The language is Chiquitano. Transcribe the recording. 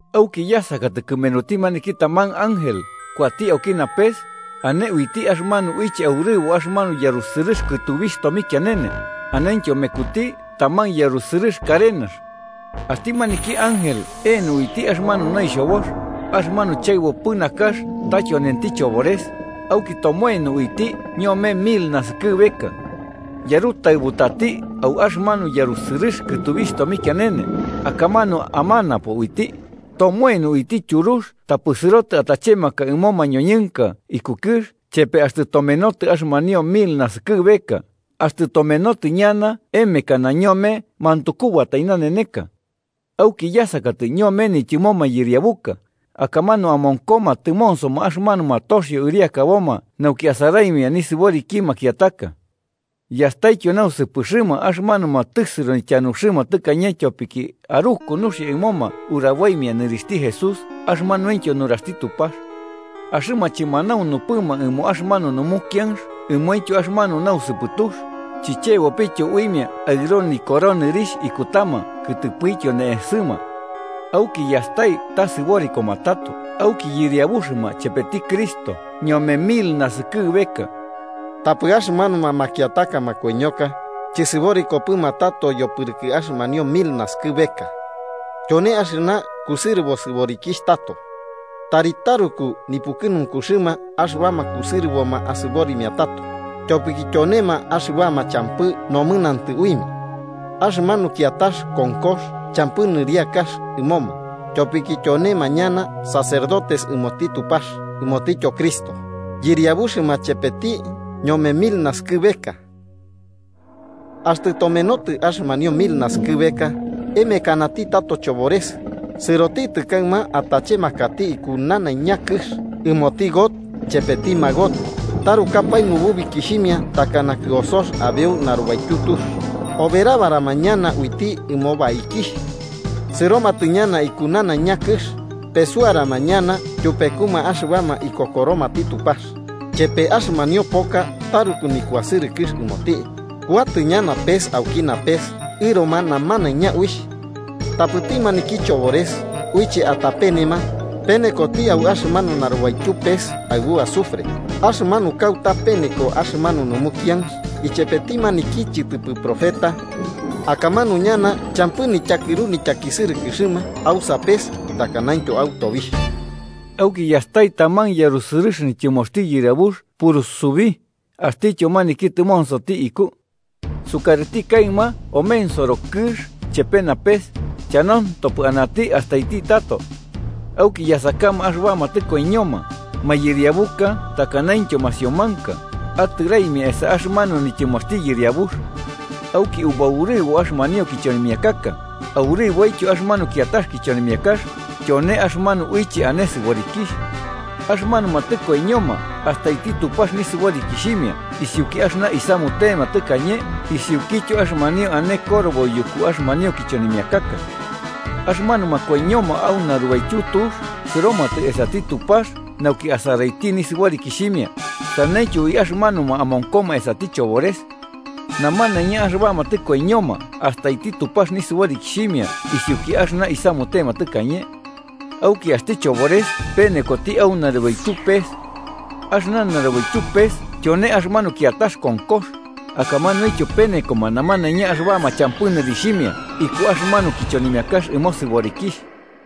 Auki yasakatɨ kɨmenuti maniki taman ángel kuati auki napes ane uiti axɨmanu uiche aurɨbo axɨmanu yarusɨrɨx kɨtubixh tomikianene anentyo mekuti taman yarusɨrɨx karenax. Axti maniki ángel eno uiti axɨmanu noixhobox, axɨmanu chaɨbopɨ nakax ta tyonenti chobores, auki tomoeno uiti ñome mil naskɨbeka. Yarutaɨbutati au axɨmanu yarusɨrɨx kɨtubixh tomikianene, akamanu amanapo uiti, tomoeno uiti tyurux tapɨ sɨrotɨ atachemaka ɨmo mañoñɨnka iku kɨx chepe axtɨ tomenotɨ axɨmanio mil naskɨbeka, axtɨ tomenotɨ ñana emekana ñome mantukubatai naneneka. Auki yasakatɨ ñome nityɨmo mayɨriabuka, akamanu amonkoma tɨmonsoma axɨmanuma toxio ɨriakaboma nauki asaraimia nisɨboriki makiataka. Yastaityo nausɨpɨxɨma axɨmanuma tɨsɨro nityanuxɨma tɨkañe tyopiki aruku nuxia ɨmoma uraboimia nɨrixhti Jesús axɨmanuintyo nuraxti Tupax. Axɨma chɨmanaunuma ɨmo axɨmanu numukianx ɨmointyo axɨmanu nausɨpɨtux, chichebopɨtyo uimia aɨro nikoro nɨrixh ikutama kɨtɨpɨtyo ne'esɨma. Auki yastai ta sɨborikoma tato auki yɨriabuxɨma chepeti Cristo ñome mil naskɨbeka. Tapɨ axɨmanuma makiataka makoiñoka chɨsɨborikopɨma tato yopɨrɨkɨ axɨmanio mil naskɨbeka. Tyone axɨna kusɨrɨbo sɨborikixh tato. ¡Tari taruku nipukɨnunkuxɨma axɨbama kusɨrɨboma asɨborimia tato, tyopiki tyonema axɨbama champɨ nomɨnantɨ uimia! Axɨmanu kiatax konkox champɨ nɨriakax ɨmoma, tyopiki tyonema ñana sacerdotes ɨmoti Tupax ɨmotityo Cristo, yɨriabuxɨma chepeti ñome mil naskɨbeka. Axtɨ tomenotɨ axɨmanio mil naskɨbeka, emekanati tato chobores, sɨrotitɨ kaɨma atachemakati iku nanaiña kɨx ɨmoti Gog chepeti Magog, tarukapae nububikixhimia takana kɨosox abeuki narubaityu tux, oberabarama ñana uiti ɨmo baikixh. Sɨromatɨ ñana iku nanaiña kɨx, pesuarama ñana tyupekuma axɨbama ikokoromati Tupax, chepe axɨmanio poka taruku nikuasɨrɨkɨx ɨmoti, kuatɨ ñana pes auki napes ɨroma namanaiña uixh. Tapɨti maniki chobores, uiche atapenema, penekoti au axɨmanu narubaityu pes aɨbu azufre, axɨmanu kauta peneko axɨmanu numukianx ichepeti maniki chɨtɨpɨ profeta. Akamanu ñana champɨ nityakɨru nityakisɨrɨkɨxɨma au sapes takanaintyo au tobixh. Auki yastai taman yarusɨrɨx nityɨmoxti Yɨriabux purusubi, axtityo maniki tɨmonsoti iku. Sukarɨti kaɨma omensoro kɨx chepe napes, chanantopɨ anati astaiti tato. Auki yasakama axɨbama tɨkoiñoma, mayɨriabuka takanaintyo masiomanka, atɨraimia esa axɨmanu nityɨmoxti Yɨriabux. Auki ubaurɨbo axɨmanio kichonimiakaka, aurɨboityo axɨmanu kiatax kichonimiakax, tyone axɨmanu uiche ane sɨborikixh. Axɨmanuma tɨkoiñoma astaiti Tupax nisɨborikixhimia isiuki axɨna isamutema tɨkañe isiukityo axɨmanio ane korobo yuku axɨmanio kichonimiakaka. Axɨmanuma koiñoma au narubaityu tux sɨromatɨ esati Tupax nauki asaraiti nisɨborikixhimia, saneityo ui axɨmanuma amonkoma esati chobores. Namanaiña axɨbama tɨkoiñoma astaiti Tupax nisɨborikixhimia isiuki axɨna isamutema tɨkañe. Auki axti chobores penekoti au narubaityu pes. Axɨna narubaityu pes tyone axɨmanu kiatax konkox, akamanuintyo penekoma namanaiña axɨbama champɨ nɨrixhimia iku axɨmanu kichonimiakax ɨmo sɨborikixh.